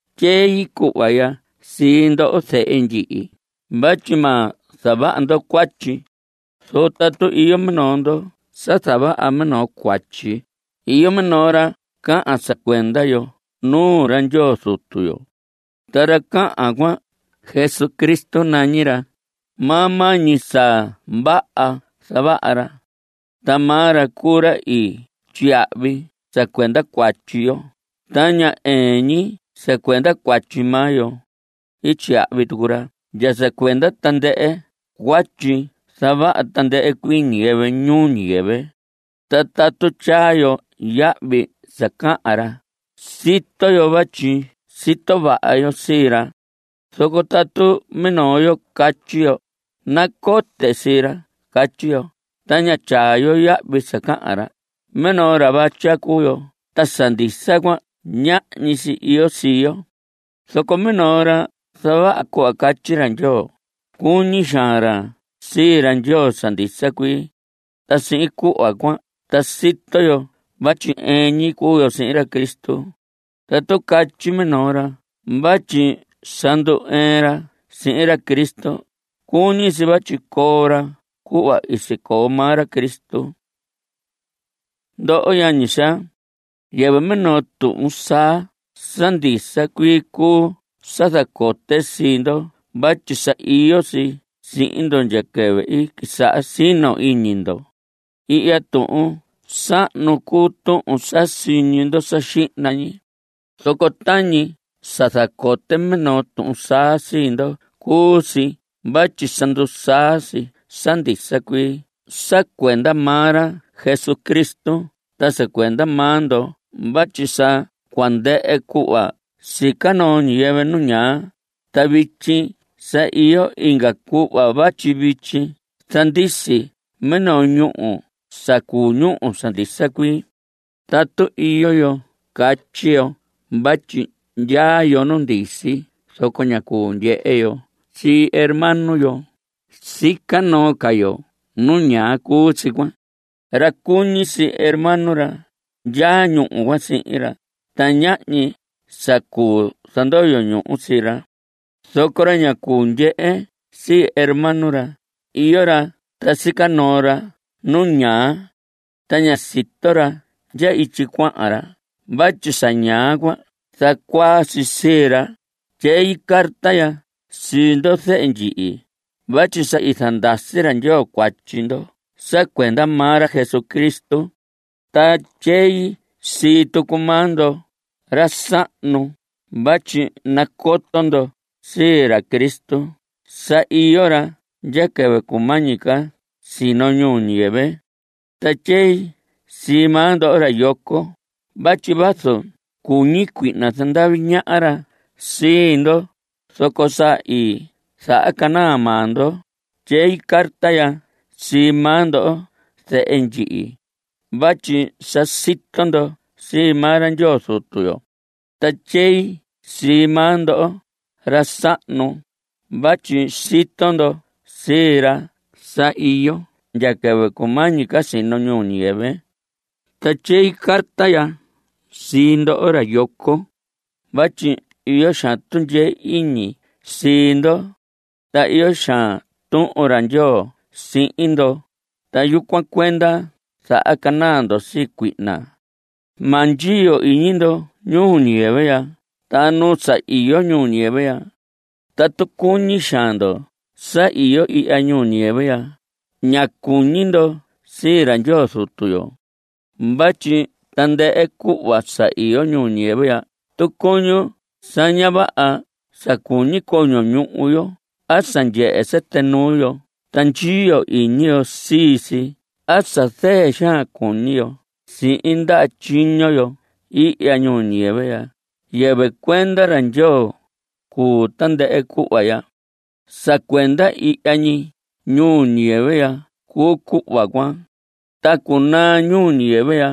Tyei cuhva ya sii ndoho, zehe ndyihi, vatyi ma zavaha ndo cuatyi. Zoco tatu iyo minoo ndo sa zavaha minoo cuatyi, iyo minoo ra cahan sa cuenda yo nuu ra Ndyoo Zutu yo. Ta ra cahan cuan, Jesucristo nañi ra. Maa maa ñi sa vaha zavaha ra. Ta maa ra cuu ra i tyiyahvi sa cuenda cuatyi yo. Ta ña ɨɨn ñi sa cuenda cuatyi maa yo. Tyiyahvi tucu ra ndya sa cuenda tandɨhɨ cuatyi zavaha tandɨhɨ cuii ñiyɨvɨ ñuu ñiyɨvɨ. Ta tatu tyaa yo yahvi sa cahan ra, sito yo vatyi sito vaha yo sii ra. Zoco tatu minoo yo catyi yo: “Nacote sii ra”, catyi yo, ta ña tyaa yo yahvi sa cahan ra, minoo ra vatya cuu yo, ta sa ndisa cuan ñahñi si iyo sii yo. Zoco minoo ra zavaha cuhva catyi ra Ndyoo, cuñi xaan ra sii ra Ndyoo sa ndisa cuii. Ta sihin cuhva cuan ta sito yo vatyi ɨɨn ñi cuu yo sihin ra Cristo. Tatu catyi minoo ra vatyi sa ndu‑ɨɨn ra sihin ra Cristo, cuñi si vatyi coo ra cuhva i sicoo maa ra Cristo. Ndoho yañi xaa, yɨvɨ minoo tuhun saa sa ndisa cuii cuu sa zacote sii ndo vatyi sa iyo si sihin ndo ndya quɨvɨ quisaha sino iñi ndo. Ihya tuhun sahnu cuu tuhun sa siñi ndo sa xihna ñi. Zoco tañi sa zacote minoo tuhun saa sii ndo cuu si vatyi sa ndusaa si sa ndisa cuii sa cuenda maa ra Cristo ta sa cuenda maa ndo vatyi sa cua ndɨhɨ cuhva sica noo ñiyɨvɨ nu ñaa, ta vityi sa iyo inga cuhva vatyi vityi zandisi minoo ñúhu sa cuu ñúhu sa ndisa cuii. Tatu iyo yo catyi yo vatyi ndyaa yo nu ndisi zoco ña cuu ndyehe yo sii hermano yo, sica noo ca yo nu ñaa cuu si cuan. Ra cuñi sii hermano ra, ndyaa ñúhu cuan sihin ra. Ta ñahñi sa cuu zandoyo ñuhu sii ra. Zoco ra ña cuu ndyehe sii hermano ra, iyo ra ta sica noo ra nu ñaa. Ta ña sito ra ndya ityi cuahan ra vatyi sa ñaa cuan zacuaa si sii ra. Tyei carta ya sii ndo, zehe ndyihi, vatyi sa i zandasi ra Ndyoo cuatyi ndo sa cuenda maa ra Jesucristo. Ta tyei sii tucu maa ndoho, ra sahnu, vatyi nacoto ndo sii ra Cristo. Sa iyo ra ndya quɨvɨ cumañi ca sino ñuu ñiyɨvɨ. Ta tyei sii maa ndo, ra yoco, vatyi vazu cuñi cuihna zandavi ñaha ra sii ndo, zoco sa i zahacanaa maa ndo. Tyei carta ya sii maa ndo, zehe ndyihi, vatyi sa sito ndo sii maa ra Ndyoo Zutu yo. Ta tyei sii maa ndo, ra sahnu, vatyi sito ndo sii ra sa iyo ndya quɨvɨ cumañi ca sino ñuu ñiyɨvɨ. Ta tyei carta ya sii ndoho, ra yoco, vatyi iyo xaan tundyee iñi sii ndo. Ta iyo xaan Tuhun ra Ndyoo sihin ndo, ta yucuan cuenda zahacanaa ndo sii cuihna. Ma ndyiyo iñi ndo ñuu ñiyɨvɨ ya ta nu sa iyo ñuu ñiyɨvɨ ya. Tatu cuñi xaan ndo sa iyo ihya ñuu ñiyɨvɨ ya, ña cuñi ndo sii ra Ndyoo Zutu yo. Vatyi tandɨhɨ cuhva sa iyo ñuu ñiyɨvɨ ya tucuñun sa ña vaha sa cuñi coño ñuhu yo a sa ndyehe sɨtɨ nuu yo ta ndyiyo iñi yo sii si a sa zɨɨ xaan cuñi yo sihin ndaha tyiño yo ihya ñuu ñiyɨvɨ ya, yɨvɨ cuenda ra Ndyoo cuu tandɨhɨ cuhva ya. Sa cuenda ihya ñi ñuu ñiyɨvɨ ya cuu cuhva cuan. Ta cunaa ñuu ñiyɨvɨ ya.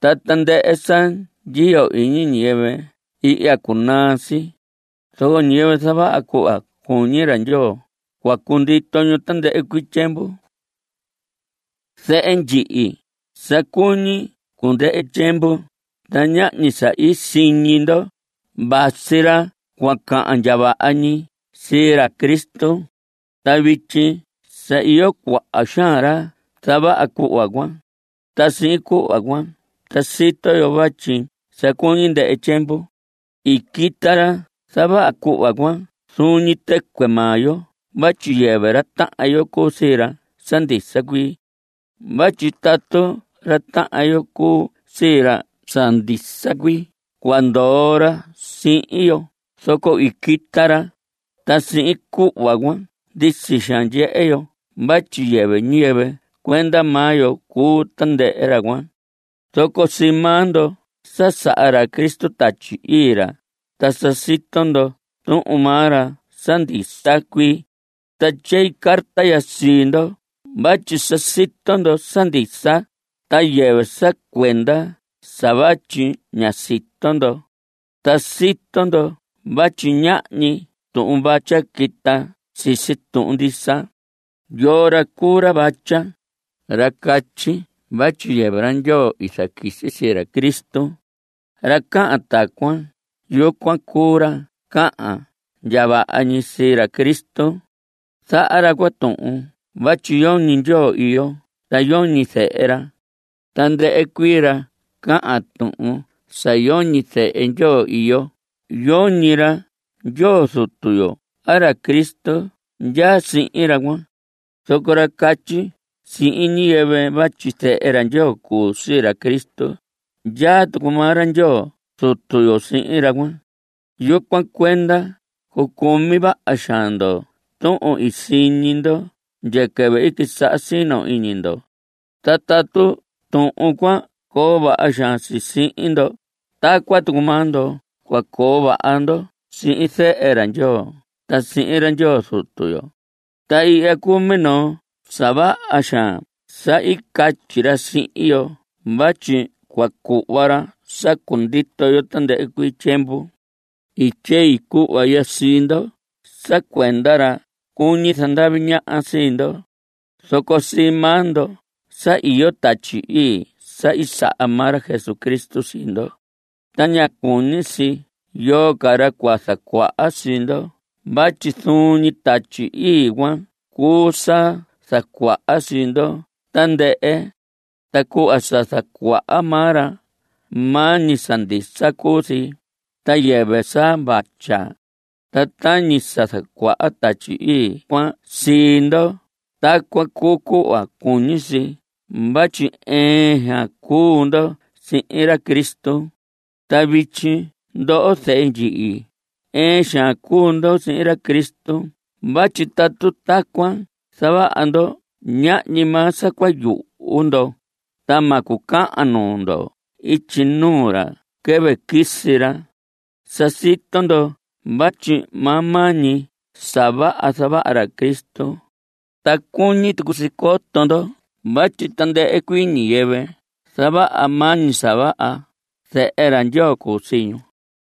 Ta tandɨhɨ sa ndyiyo iñi ñiyɨvɨ ihya, cunaa si. Zoco ñiyɨvɨ zavaha cuhva cuñi ra Ndyoo, cua cundito ñu tandɨhɨ cuii tyiemvu. Zehe ndyihi, sa cuñi cundɨhɨ tyiemvu, ta tañi sa i siñi ndo, vasi ra cua cahan ndya vaha ñi sii ra Cristo. Ta vityi sa iyo cuaha xaan ra zavaha cuhva cuan. Ta sihin cuhva cuan ta sito yo vatyi sa cuñi cundɨhɨ tyiemvu. I quita ra zavaha cuhva cuan zuun ñi tɨcuɨ maa yo vatyi yɨvɨ ra tahan yo cuu sii ra sa ndisa cuii. Vatyi tatu ra tahan yo cuu sii ra sa ndisa cuii cua ndoo ra sihin yo. Zoco i quita ra, ta sihin cuhva cuan ndisi xaan ndyehe yo vatyi yɨvɨ ñiyɨvɨ cuenda maa yo cuu tandɨhɨ ra cuan. Zoco sii maa ndo sa saha ra Cristo Tatyi Ii ra, ta sa sito ndo Tuhun maa ra sa ndisa cuii. Ta tyei carta ya sii ndo vatyi sa sito ndo sa ndisa, ta yɨvɨ sa cuenda sa vatyi ña sito ndo. Ta sito ndo vatyi ñahñi tuhun vatya quita sisi tuhun ndisa. ¿Yoo ra cuu ra vatya? Ra catyi vatyi yɨvɨ ra Ndyoo i zaquisi sii ra Cristo. Ra cahan tacuan, yucuan ra cuu ra cahan ndya vaha ñi sii ra Cristo. Zaha ra cuan tuhun vatyi yoñi Ndyoo iyo ta yoñi zehe ra. Tandɨhɨ cuii ra cahan tuhun sa yoñi zehe Ndyoo iyo, yoñi ra Ndyoo Zutu yo a ra Cristo ndyaa sihin ra cuan. Zoco ra catyi sihin ñiyɨvɨ vatyi Zehe ra Ndyoo cuu sii ra Cristo, ndyaa tucu maa ra Ndyoo Zutu yo sihin ra cuan. Yucuan cuenda, cucumi vaha xaan ndo tuhun i siñi ndo ndya quɨvɨ i quisaha sino iñi ndo. Ta tatu tuhun cuan coo vaha xaan si sihin ndo, tacuan tucu maa ndo cua coo vaha ndo sihin Zehe ra Ndyoo ta sihin ra Ndyoo Zutu yo. Ta ihya cuu minoo sa vaha xaan sa i catyi ra sihin yo vatyi cua cuhva ra sa cundito yo tandɨhɨ cuii tyiemvu. I tyei cuhva ya sii ndo sa cuenda ra cuñi zandavi ñaha sii ndo. Zoco sii maa ndo sa iyo Tatyi Ii sa i saha maa ra Jesucristo sii ndo. Ta ña cuñi si yoo ca ra cua zacuaha sii ndo vatyi zuun ñi Tatyi Ii cuan cuu sa zacuaha sii ndo tandɨhɨ. Ta cuhva sa zacuaha maa ra, maa ñi sa ndisa cuu si, ta yɨvɨ sa vatya. Ta tañi sa zacuaha Tatyi Ii cuan sii ndo, tacuan cuu cuhva cuñi si vatyi ɨɨn xaan cuu ndo sihin ra Cristo. Ta vityi ndoho, zehe ndyihi, ɨɨn xaan cuu ndo sihin ra Cristo vatyi tatu tacuan zavaha ndo ñahñi maa sa cua yuhu ndo, ta ma cucahan nuu ndo ityi nuu ra quɨvɨ quisi ra. Sa sito ndo vatyi maa maa ñi sa vaha zavaha ra Cristo. Ta cuñi tucu si coto ndo vatyi tandɨhɨ cuii ñiyɨvɨ zavaha maa ñi sa vaha, zehe ra Ndyoo cuu sii ñu.